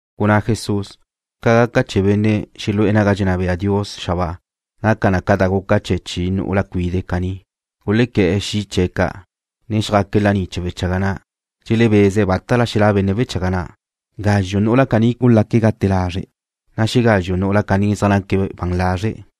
Gunná Jesús: ―Ca gaca chee̱ benne' xelu'e̱ naga dxenná bea Dios xabáa naca na ca da guca chee̱ chi nu'ula cuide' caní. Gulequé̱'e̱ xi' chee̱' ca', chee̱ chjaque̱' laní chee̱ wechaga na', dxelebeze̱' bátala xelá' benne' wechaga na'. Gazxu' nu'ula caní gulaque̱' gat lazre', na' xegazxu' nu'ula caní zaj naque̱' ban lazre'.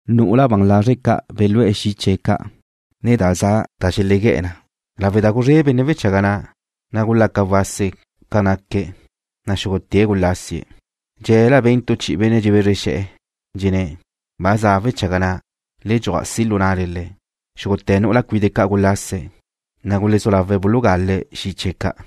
Nu'ula ban lazre' ca' belú'e̱ xi' chee̱' ca', ne da za zxezxe na da xelegué̱'e̱ na. Lawe' da guzré benne' wechaga na', na' gulaca wase ca zaj naque̱', na' xúgute̱' gulasie̱'. Dxe̱la ben tu chi'i benne' dxebezre xe̱'e̱, dxenné̱': “Ba za' wechaga na'. Le dxuaj si' lu na'le le̱'.” Xúgute̱ nu'ula cuide' caní gulase̱', na' gulezú lawe̱' bulugale̱' xi' chee̱' ca'.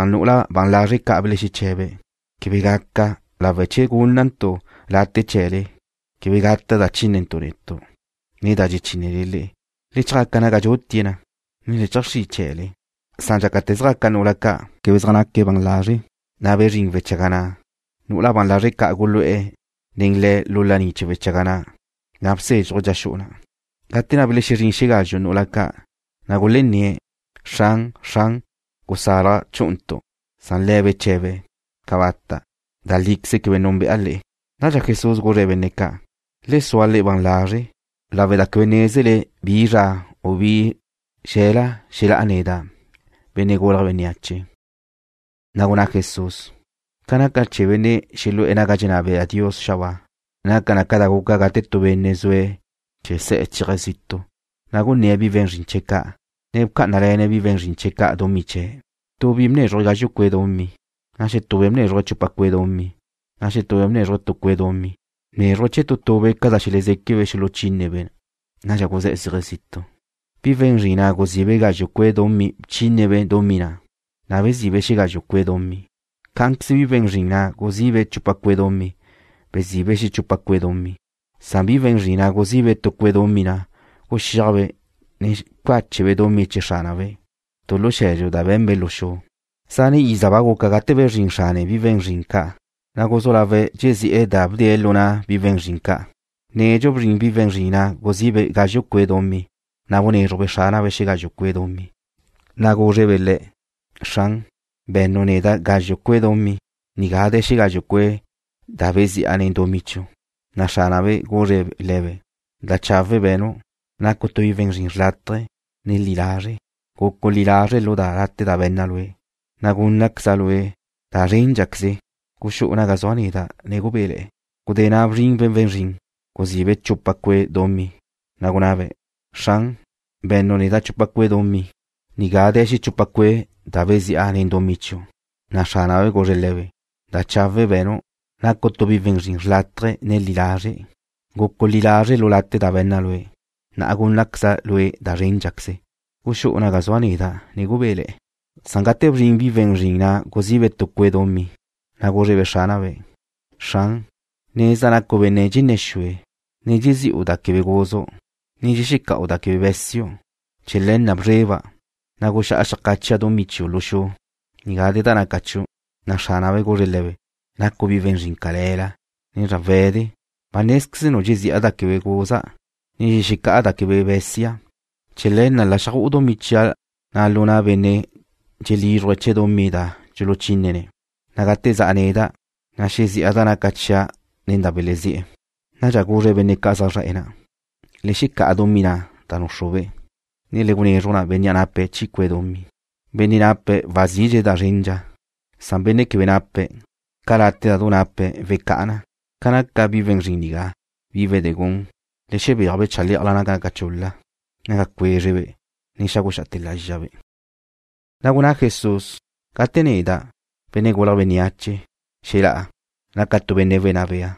Nu'ula ban lazre' ca' belexeche̱be̱': “Quebe gaca, lawe' da che gúnnantu' late' chee̱le, quebe gaca na da dxechínnentu' netu', ne da dxechínnele le'e. Le chjácala naga dxutie̱' na, ne le cheajxrí chee̱le.” Dxácate̱ zjaca nu'ula ca' quebe zaj naque̱' ban lazre', na' bezrín wechaga na'. Nu'ula ban lazre' ca' gulu'e̱ nen le̱' lu laní chee̱ wechaga na', na' bsezxuj dxa xu'u na'. Gudé na' belexezrín xegazxu' nu'ula ca', na' gulenné̱': “Xran, Xran, gusalaj chú'untu'.” Le̱' beche̱be̱': “Cabata'. Da líqueze quebe núnbe'a le'e.” Nadxa Jesús guzre̱' benne' ca': ―Le sua le'e ban lazre', lawe' da quebe nézele bi zra, u bi xel-la' xelá'a neda', Benne' Gulje̱' Bénneache. Na' gunná Jesús: ―Ca gaca chee̱ benne' xelu'e̱ naga dxenná bea Dios xabáa, naca na ca da guca gate tu benne' zue̱' chee̱ se̱'e̱ chéaje̱' zitu', na' gunné̱' bi we̱n zrin chee̱' ca', ne bcá'anale̱ne̱' bi we̱n zrin ca' dumí chee̱'. ’Tu bi ca' bnézruje̱' gazxu' cue' dumí, na' xetube' bnézruje̱' chupa cue' dumí, na' xetube' bnézruje̱' tu cue' dumí. Bnézruje̱' chee̱ tu tube' ca da xelezéquebe' xuluchínebe' na. Nadxa guzé̱'e̱ zéaje̱' zitu'. Bi we̱n zrin na' guzi'be' gazxu' cue' dumí bchínebe' dumí na', na' bezi'be' xegazxu' cue' dumí. Cá'anqueze bi we̱n zrin na' guzi'be' chupa cue' dumí, bezi'be' xechupa cue' dumí. Bi we̱n zrin na' guzí'be' tu cue' dumí na' guxíajbe', ne bcáchebe' dumí chee̱ xránabe' tu lu xe̱dxu da be̱nbe' lu xu. ’Zane' iza ba guca gate bezrín xrane bi we̱n zrin ca', na' guzú lawe̱' dxezi'e̱ da bdee̱' lu na' bi we̱n zrin ca'. Nedxu bzrin bi we̱n zrin na' guzí'be' gazxu' cue' dumí, na' bnézrujbe' xránabe' xegazxu' cue' dumí, na' gúzrebe' le̱': “Xran, be̱nnu' neda' gazxu' cue' dumí. Nigá de̱ xegazxu' cue' da bezi'a nen dumí chiu'.” Na' xránabe' guzre̱' le̱be': “Da chawe' be̱nu'. Nacu' tu bi we̱n zrin xrlátaje, ne li lazre'. Gucu' li lazre' lu late' da be̱nna' lue', na' gúnnaqueza' lue' da zréndxaqueze. Guxú'u naga zua' neda', ne gubéle̱'e̱.” Gudé na' bzrin bi we̱n zrin na' guzi'be' chupa cue' dumí, na' gunabe': “Xran, be̱nnu' neda' chupa cue' dumí. Nigá de̱ xechupa cue' da bezi'a nen dumí chiu'.” Na' xránabe' guzre̱' le̱be': “Da chawe' be̱nu'. Nacu' tu bi we̱n zrin xrlátaje, ne li lazre'. Gucu' li lazre' lu late' da be̱nna' lue', na' gúnnaqueza' lue' da zréndxaqueze. Guxú'u naga zua' neda', ne gubéle̱'e̱.” Gate bzrin bi we̱n zrin na' guzi'be' tu cue' dumí, na' gúzrebe' xránabe': “Xran, nezda' nacu' benne' dxenné̱ xue, ne dxezi'u da quebe guzu', ne dxexeca'u da quebe be̱siu'. Chee̱ le̱ na' bzreba', na' guxá'a xeajcáchia' dumí chiu' lu xu. Nigá de̱ da naca chiu'.” Na' xránabe' guzre̱' le̱be': “Nacu' bi we̱n zrin cale̱la, ne zrawe̱de. Ba nézqueznu' dxezi'a da quebe guza', ne dxexecá'a da quebe be̱sia'. Chee̱ le̱ na' la xju'u dumí chia' na' lu na' benne' dxelízruje̱' chee̱ dumí da dxuluchínene̱', na' gate za' neda', na' xezi'a da naca chia' nen da belezí'e̱.” Nadxa guzre̱' benne' ca' zaj zre̱'e̱ na': “Le xecá'a dumí na' da núxrube', ne le gunezruj na bénnea' nape̱' chi cue' dumí. Benne' nape̱' wazidxe̱' da zrendxa, na' benne' quebe nape̱', ca late' da du na' nape̱' wecá'a na. Ca naca bi we̱n zrin nigá, bi wedegún, le xebéaj-be' chalé'ajla naga naca chul-la, naga cuézrebe', ne xáguxa'ate̱ lázxabe'.” Na' gunná Jesús: ―Gate xelá'a neda', Benne' Gulje̱' Bénneache, ne Benne' Wenná Bea,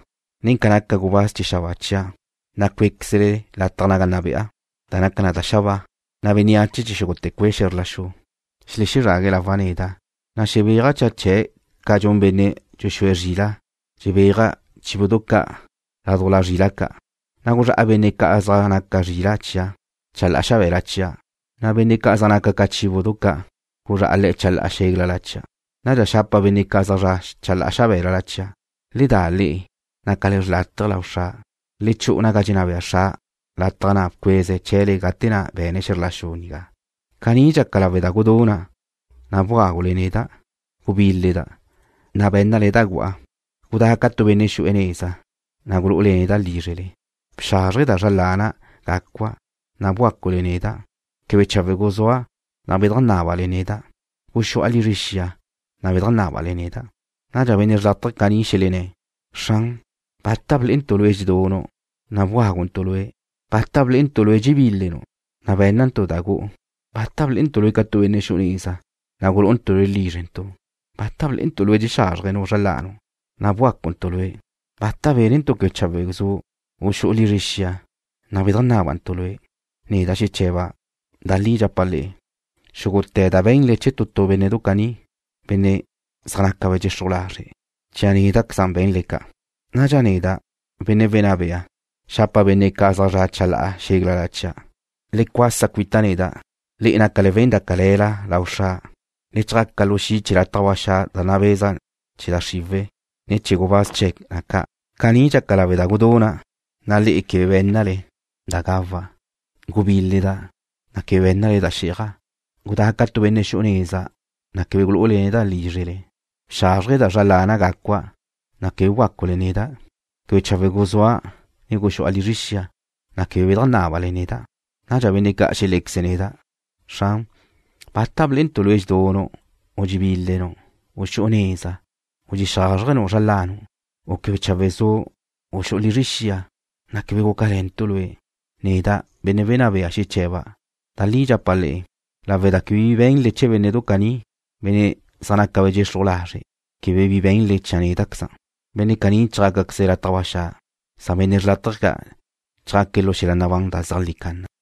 nen ca naca gubáz chee̱ xabáa chia', na' cué'queza' lataj naga nna be'a, da naca na da xabáa. Na' bénneache chee̱ xúgute̱ cue' xe̱zr la xu xelexezrague̱' lawa' neda', na' xebéaja' cha chee̱' ca dxun benne' dxuxúe̱' zrila'. xebéaje̱' chíbudu ca' ládujla zrila' ca'. Guzrá'a benne' ca' zaj naca zrila' chia' chalá'a xabe̱la chia', na' benne' ca' zaj naca ca chíbudu ca' guzrá'a le̱' chalá'a xéglala chia'. Nadxa xapa' benne' ca' zaj zra' chalá'a xabe̱la chia': “Le da le'e, nácale xrlátaje lau Xra'. Le chu'u naga dxenná bea Xra', lataj na' bcueze̱' chee̱le gate na' be̱ne̱' xe̱zr la xu nigá. Caní dxaca lawe' da guduna', na' bgágule neda'. Gubíleda', na' bé̱nnale da gu'a. Gudá' ca tu benne' xu'e̱ neza, na' gulu'ule neda' lízrele. Bxázrjeda' zra lana' gácua', na' bgácule neda'. Quebe chawe' guzúa', na' bedajnábale neda'. Guxu'a lizre xia, na' bedajnábale neda'.” Nadxa benne' xrlátaje caní xelenné̱': “Xran, ¿bata blé'entu' Lue' dxedunu', na' bgáguntu' Lue'? ¿Bata blé'entu' Lue' dxebílenu', na' bé̱nnantu' da gu'u? ¿Bata blé'entu' Lue' ca tu benne' xu'e̱ neza, na' gulú'untu' Lue' lízrentu'? ¿Bata blé'entu' Lue' dxexázrjenu' zra lanu', na' bgácuntu' Lue'? ¿Bata bénentu' quebe chawe' zu', u xu'u lizre xia, na' bedajnábantu' Lue'?” Neda' xeche̱ba': Da li dxapa' le'e, ca da be̱nle chee̱ bénnedu caní, benne' zaj naca dxexruj lazre', chee̱ néda'queza' be̱nle ca'. ’Nadxa neda', Benne' Wenná Bea, xapa' benne' ca' zaj zra' chalá'a xéglala chia': Le cuasa cuita' neda', le'e, nácale we̱n da cale̱la lau Xra'. Le chjaca lu xi' chee̱ lataj ba xa' da nabeza na chee̱ da xriwe̱', ne chee̱ gubáz chee̱ na ca'. Caní dxaca lawe' da guduna', na' le'e quebe bé̱nnale da gawa'. Gubíleda', na' quebe bé̱nnale da xí'aja'. Gudá' ca tu benne' xu'e̱ neza, na' quebe gulu'ule neda' lízrele. Bxázrjeda' zra lana' gacua', na' quebe bgácule neda'. Quebe chawe' guzúa' ne guxu'a lizre xia, na' quebe bedajnábale neda'. Nadxa benne' ca' xelé̱queze̱' neda': “Xran, ¿bata blé'entu' Lue' dxedunu', u dxebílenu', u xu'u neza, u dxexázrjenu' zra lanu', u quebe chawe' zu', u xu'u lizre xia, na' quebe gúcale̱ntu' Lue'?” Neda', benne' wenná bea, xeche̱ba': Da li dxapa' le'e, lawe' da quebe bi be̱nle chee̱ bénnedu caní, benne' zaj naca dxexruj lazre', quebe bi be̱nle chee̱ néda'queza'. Benne' caní chjácaqueze̱' lataj ba xa', na' benne' xrlátaje ca' chjaque̱' lu xel-la' nabán da zeajlí canna.